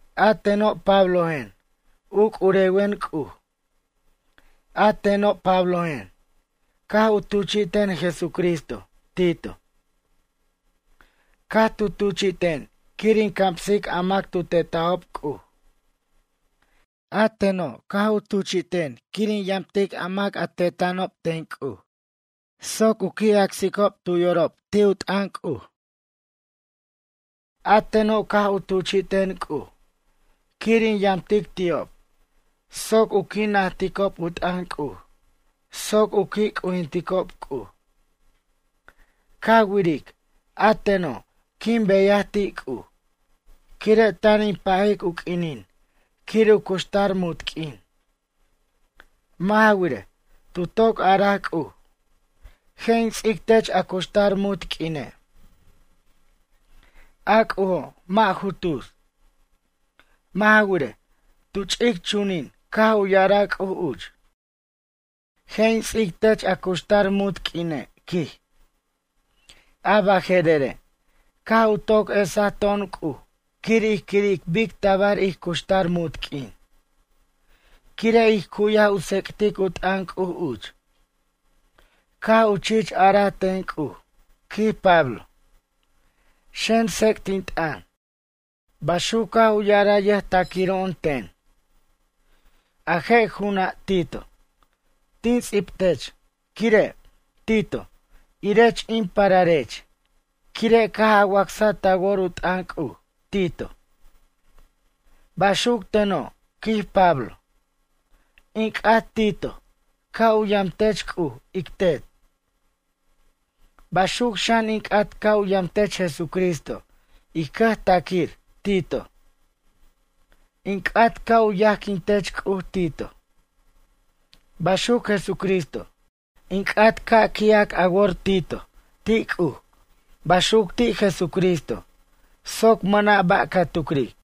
A teno' Pablojen, u c'urewen C'uj. A teno' Pablojen, caj u tuchi'ten Jesucristo, Tito. Caj tu tuchi'ten quir in camsic a mac a tu tetajob C'uj. A teno' caj u tuchi'ten quir in yamtic a mac a teta'anob ten C'uj, soc u qui' acsicob tu yorob ti' u t'ʌn C'uj. A teno' caj u tuchi'ten C'uj quir in yamtic ti'ob soc u qui' najticob u t'ʌn C'uj soc u qui' c'ujinticob C'uj. Ca wiric, a teno' quin beyaj ti' C'uj, quire' tan in pajic u q'uinin quir in cuxtar munt q'uin. Mʌ' ja wirej, tu toc araj C'uj: ―Je' in ts'ic tech a cuxtar munt q'uine'. A C'ujo' mʌ' ju tus. Mʌ' ja wirej, tu ch'ic chunin caj u ya'araj C'uj uch: ―Je' in ts'ic tech a cuxtar munt q'uine', quij. A baje'rere', caj u toc esa to'on C'uj quir ij quiric bic tabar ij cuxtar munt q'uin. Quire' ij cu'yaj u tsec'tic u t'ʌn C'uj uch. Caj u chich araj ten C'uj, quij Pablo: ―Xen tsec't in t'ʌn. Baxuc caj u ya'araj yʌjtaquiro'on ten. A je' ju'una' Tito, tin ts'ibtech quire', Tito, irech in pararech quire', caj a wacsa ta wor u t'ʌn C'uj, Tito. Baxuc teno', quij Pablo. In c'at Tito, ca' u yamtech C'uj ic Tet. Baxuc xan in c'at ca' u yamtech Jesucristo ij cʌjtaquir, Tito. In c'at ca' u yajquin tech C'uj, Tito. Baxuc Jesucristo. In c'at ca' qui'ac a wor Tito ti' C'uj baxuc ti' Jesucristo, soc mʌna' ba' ca tucric.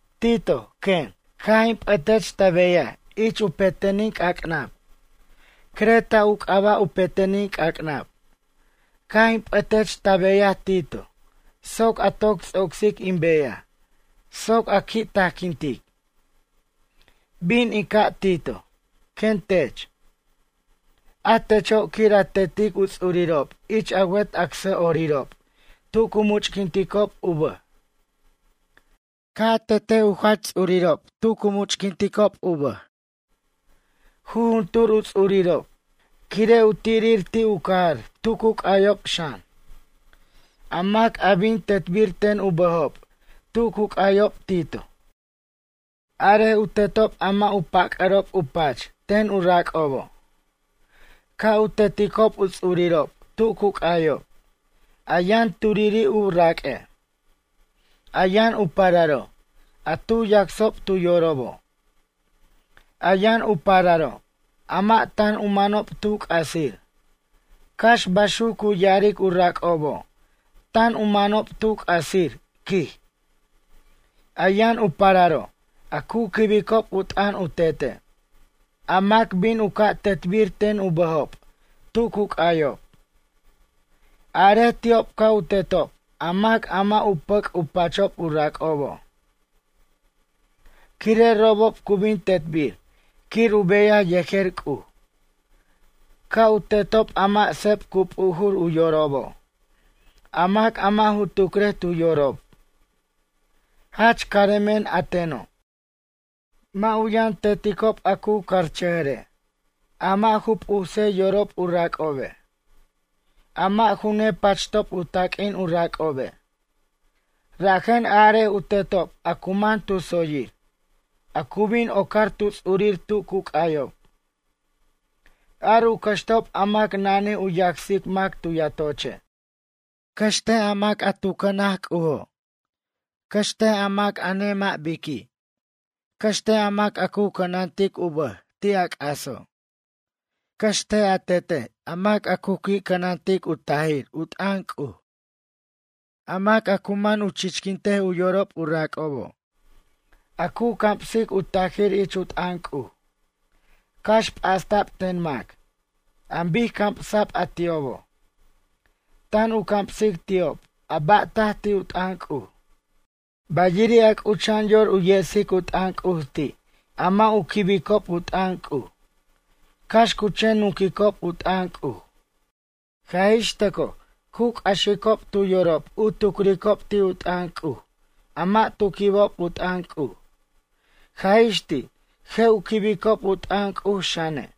Tito, quen. Caj in p'ʌtech ta beyaj ich u petenin c'ac'nab. Creta u c'aba' u petenin c'ac'nab. Caj in p'ʌtech ta beyaj Tito soc a toc ts'ocsic in beyaj soc a qui' tajquintic. “Bin in ca' Tito”, quen tech. A techo' quir a tetic u ts'urirob ich a wet acsʌ'orirob tu cu much'quinticob u bʌj. Ca' a tet u jach ts'urirob tu cu much'quinticob u bʌj. Jujuntur u ts'urirob, quire' u tirir ti' u cajar tu cu c'ayob xan. A mac a bin tetbir ten u bʌjob tu cu c'ayob Tito. Arej u tetob a mʌ' u pac'ʌ'rob u pach ten u rac'obo'. Ca' u teticob u ts'urirob tu cu c'ayob, a yʌn turiri' u raq'ue'. A yʌn u pararo', a tu yacsob tu yorobo'. A yʌn u pararo', a mʌ' tan u manob tu c'asir, cax baxuc cu ya'aric u rac'obo' tan u manob tu c'asir, quij. A yʌn u pararo' a cu quibicob u t'ʌn u tete'. A mac bin u ca' tetbir ten u bʌjob tu cu c'ayob. Arej ti'ob ca' u tetob a mac a mʌ' u pʌc' u pachob u rac'obo'. Quire' robob cu bin tetbir quir u beyaj yejer C'uj. Ca' u tetob a mʌ' seb cu p'ujur u yorobo'. A mac a mʌ' ju tucrej tu yorob: ―Jach caremen, a teno'. Mʌ' u yʌn teticob a cu carchʌjʌre'. A mʌ' ju p'use yorob u rac'obe'. A mʌ' ju nepachtob u taq'uin u rac'obe'. Rajen arej u tetob a cu man tu tsoyir, a cu bin ocar tu ts'urir tu cu c'ayob. Ar u cʌxtob a mac a nanij u yacsic mac tu yatoche'. Cʌxt a mac a tu cʌna C'ujo'. Cʌxt a mac a nemʌ' biqui'. Cʌxt a mac a cu cʌnantic u bʌj ti' a c'aso'. Cʌxt a tetej a mac a cu qui' cʌnantic u tajir u t'ʌn C'uj. A mac a cu man u chiquint u yorob u rac'obo'. A cu camsic u tajir ich u t'ʌn C'uj, cax p'asta'b ten mac, an bic camsa'b a ti'obo'. Tan u camsic ti'ob a ba' taj ti' u t'ʌn C'uj. Bayiri', a c'ucha'an yor u yesic u t'ʌn C'uj ti' a mʌ' u quibicob u t'ʌn C'uj. Cax cu chen nunquicob u t'ʌn C'uj. Jaj ix tʌcoj cu c'axicob tu yorob u tucurob ti' u t'ʌn C'uj a mʌ' tu quibob u t'ʌn C'uj, jaj ix ti' je' u quibicob u t'ʌn C'uj xane'.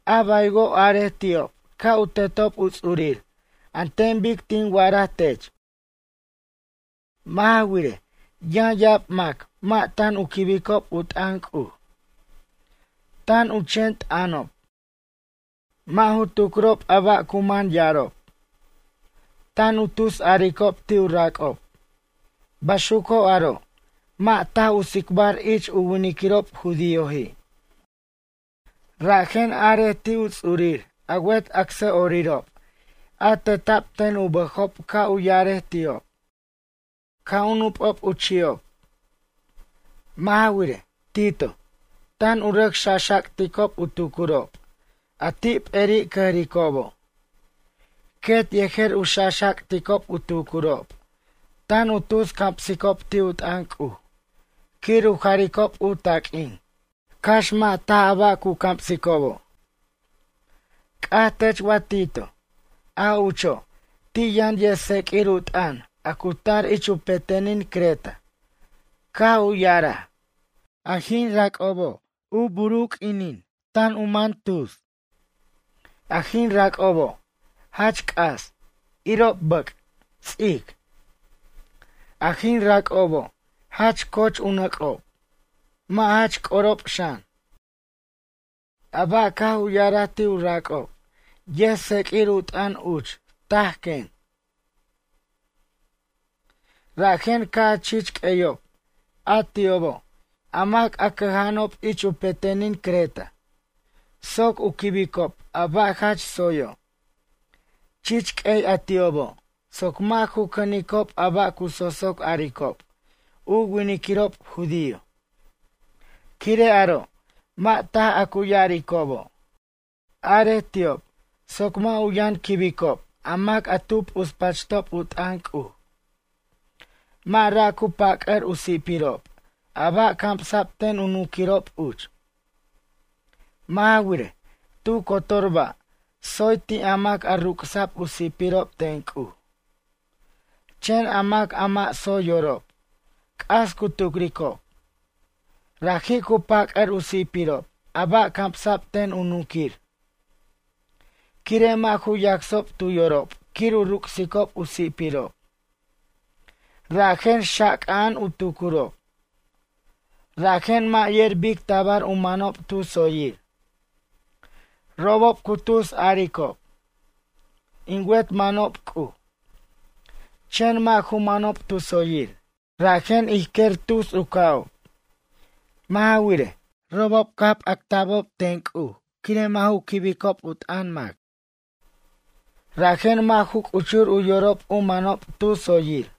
A baywo' arej ti'ob ca' u tetob u ts'urir an ten bic tin wa'araj tech. Mʌ' ja wirej, yʌn ya'ab mac mʌ' tan u quibicob u t'ʌn C'uj. Tan u chen t'ʌnob. Mʌ' ju tucrob a ba' cu man ya'arob. Tan u tusaricob ti' u rac'ob. Baxuco' aro' mʌ' taj u tsicbar ich u winiquirob judíoji'. Rajen arej ti' u ts'urir a wet acsʌ'orirob a teta'b ten u bʌjobo' ca' u ya'arej ti'ob: ―Ca' u nup'ob u chi'ob. Mʌ' ja wirej, Tito, tan u rʌc xaxac'ticob u tucurob, a ti' p'eri' cʌjricobo'. Quet yejer u xaxac'ticob u tucurob, tan u tus camsicob ti' u t'ʌn C'uj, quir u jaricob u taq'uin, cax mʌ' taj a ba' cu camsicobo'. C'aj tech wa Tito, a ucho', ti' yʌn yʌjtseq'uir u t'ʌn a cu tar ich u petenin Creta, caj u ya'araj: ―A jin rac'obo' u bur u q'uinin tan u man tus. A jin rac'obo' jach c'as, irob bʌc', ts'ic. A jin rac'obo' jach coch u nʌc'ob. Mʌ' jach c'orob xan. A ba' caj u ya'araj ti' u rac'ob, yʌjtsq'uir u t'ʌn uch taj, quen. Rajen ca' a chich q'ueyob a ti'obo' a mac a cʌja'anob ich u petenin Creta, soc u quibicob a ba' jach tsoyo'. Chich q'uey a ti'obo' soc mʌ' ju cʌnicob a ba' cu sosoc aricob, u winiquirob judío. Quire' aro', mʌ' taj a cu ya'aricobo'. Arej ti'ob soc mʌ' u yʌn quibicob a mac a tu p'uspachtob u t'ʌn C'uj. Mʌ' ra' cu pac'ʌr u si'pirob a ba' camsa'b ten u nunquirob uch. Mʌ' ja wirej, tu cotor ba' tsoy ti' a mac a ruc'sa'b u si'pirob ten C'uj. Chen a mac a mʌ' tsoy yorob, c'as cu tucricob. Raji' cu pac'ʌr u si'pirob a ba' camsa'b ten u nunquir. Quire' mʌ' ju yacsob tu yorob quir u ruc'sicob u si'pirob. Rajen xaxac'a'an u tucurob. Rajen mʌ' yer bic tabar u manob tu tsoyir. Robob cu tus a'aricob: ―In wet manob C'uj. Chen mʌ' ju manob tu tsoyir, rajen ij quer tus u ca'ob. Mʌ' ja wirej, robob caj p'acta'bobo' ten C'uj quire' mʌ' ju quibicob u t'ʌn mac. Rajen mʌ' ju c'uchur u yorob u manob tu tsoyir.